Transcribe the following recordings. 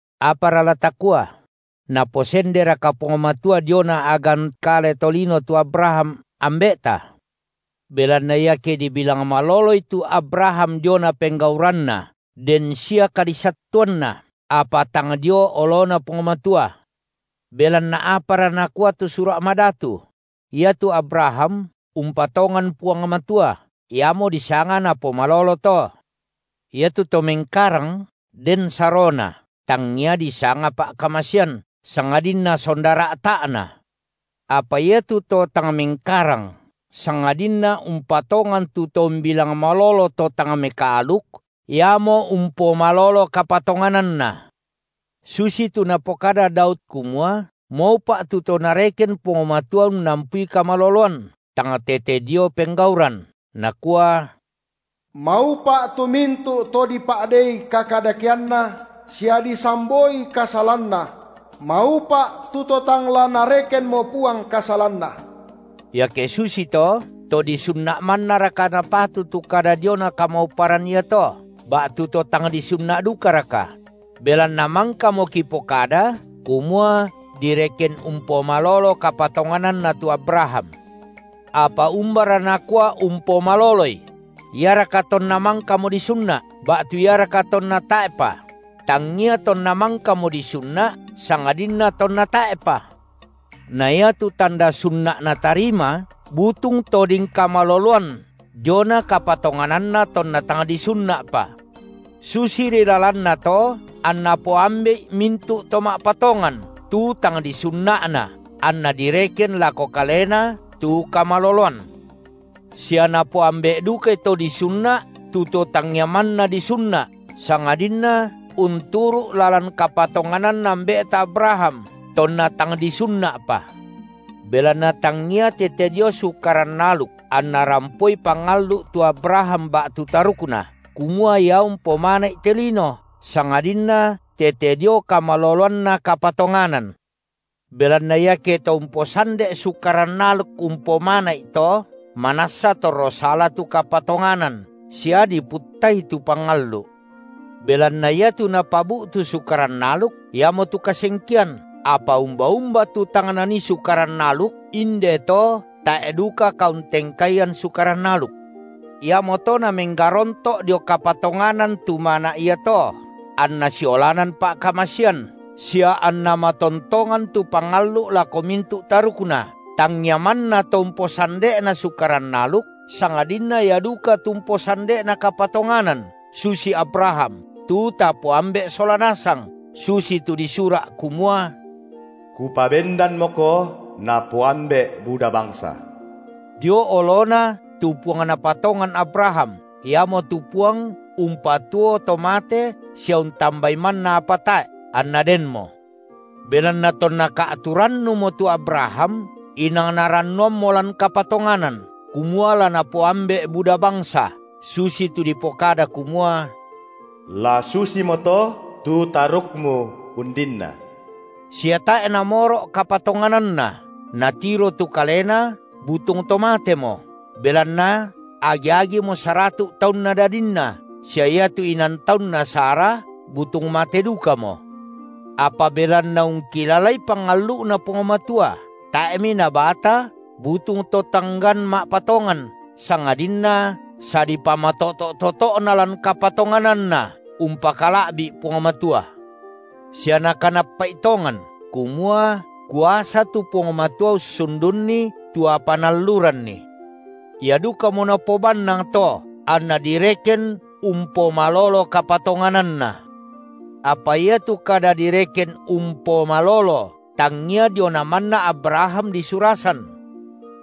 Apara la takua? Naposenderaka Puang Matua diona a’gan kale tolino tu Abraham, ambe’ta? Belanna iake dibilang maloloi tu Abraham diona penggauranna, den sia kadisattuanna, apa tang dio oloNa Puang Matua. Belanna apara nakua tu Sura’ Madatu? Iatu Abraham umpatongan Puang Matua, iamo disanga napomalolo to. Iatu to mengkarang, den sarona, tangia disanga pa’kamasean, sangadinna sonda ra’ta’na. Apa iatu to tang mengkarang, sangadinna umpatongan tu To umbilang malolo to tang mekaaluk, iamo umpomalolo kapatongananna. Susitu napokada Daud kumua maupa’ tu to nareken Puang Matua unnampui kamaloloan, tang tete dio penggauran, nakua: Maupa’ tu mintu’ to dipa’dei kakadakeanna sia disamboi kasalanna; maupa’ tu to tang la Narekenmo Puang kasalanna. Iake susito, to disunna’ mannaraka napatu tu kada diona kamauparan iato, ba’tu to tang disunna’ dukaraka? Belanna mangkamo kipokada, kumua direken umpomalolo kapatongananna tu Abraham. Apa umbara nakua umpomaloloi? Iaraka tonna mangkamo disunna’, ba’tu iaraka tonna tae’pa? Tangia tonna mangkamo disunna’, sangadinna tonna tae’pa. Na iatu tanda sunna’ natarima butung toding kamaloloan diona kapatongananna tonna tang disunna’pa. Susiri lalanna to anna poambe’i mintu’ to ma’patongan tu tang disunna’na, anna direken lako kalena tu kamaloloan. Sia napoambe’ dukai to disunna’ tu to tangia manna disunna’ sangadinna unturu’ lalan kapatongananna ambe’ta Abraham, tonna tang disunna’pa. Belanna tangia tete dio Sukaran aluk anna rampoi pangallu’ tu Abraham ba’tu tarukna, kumua ia umpomana’i te lino, sangadinna tete dio kamaloloanna kapatonganan. Belanna iake to umposande’ Sukaran aluk umpomana’i to, manassa torro sala tu kapatonganan sia diputtai tu pangallu’. Belanna iatu napabu’tu Sukaran aluk, iamotu kasengkean, apa umba-umba tu tang nanii Sukaran aluk, inde to tae’ duka kauntengkaian Sukaran aluk. Iamoto namenggaronto’ dio kapatonganan tu mana’ iato anna siolanan pa’kamasean sia anna matontongan tu pangallu’ lako mintu’ tarukna, tangia manna to umposande’na Sukaran aluk, sangadinna ia duka tu umposande’na kapatonganan susi Abraham, tu tapoambe’ sola nasang, susitu disura’ kumua: Kupabendanmoko napoambe’ buda bangsa – dio oloNa tu Puang napatongan Abraham, Iamotu Puang umpatuo to mate sia untambai manna apa tae’, anna denmo. Belanna tonna ka’tu rannumo tu Abraham, inang narannuammo lan kapatonganan, kumua la napoambe’ buda bangsa, susitu dipokada kumua: La susimoto tu tarukmu undinna. Sia tae’ namoro’ kapatongananna, natiro tu kalena butung to matemo, belanna agi-agimo saratu’ taunna dadinna, sia iatu inan taunna Sara butung mate dukamo; apa belanna ungkilalai pangallu’Na Puang Matua, tae’mi nabata butung to tanggan ma’patongan, sangadinna sadipamatoto’-toto’na lan kapatongananna umpakala’bi’ Puang Matua, sia nakanappa’i tongan, kumua kuasa tu Puang Matua ussundunni tu apa Naalluranni. Ia (dukamo) napobannang to anna direken umpomalolo kapatongananna. Apa iatu kada direken umpomalolo tangia diona manna Abraham disurasan,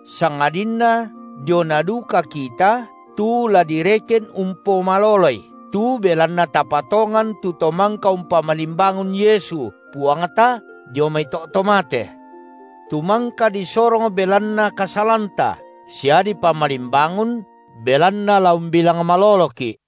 sangadinna diona duka kita tu la direken umpomaloloi tu belanna tapatongan tu To mangka umpamalimbangun Yesu, Puangta, dio mai to’ to mate, tu mangka disorong belanna kasalanta sia dipamalimbangun belanna la umbilang maloloki’.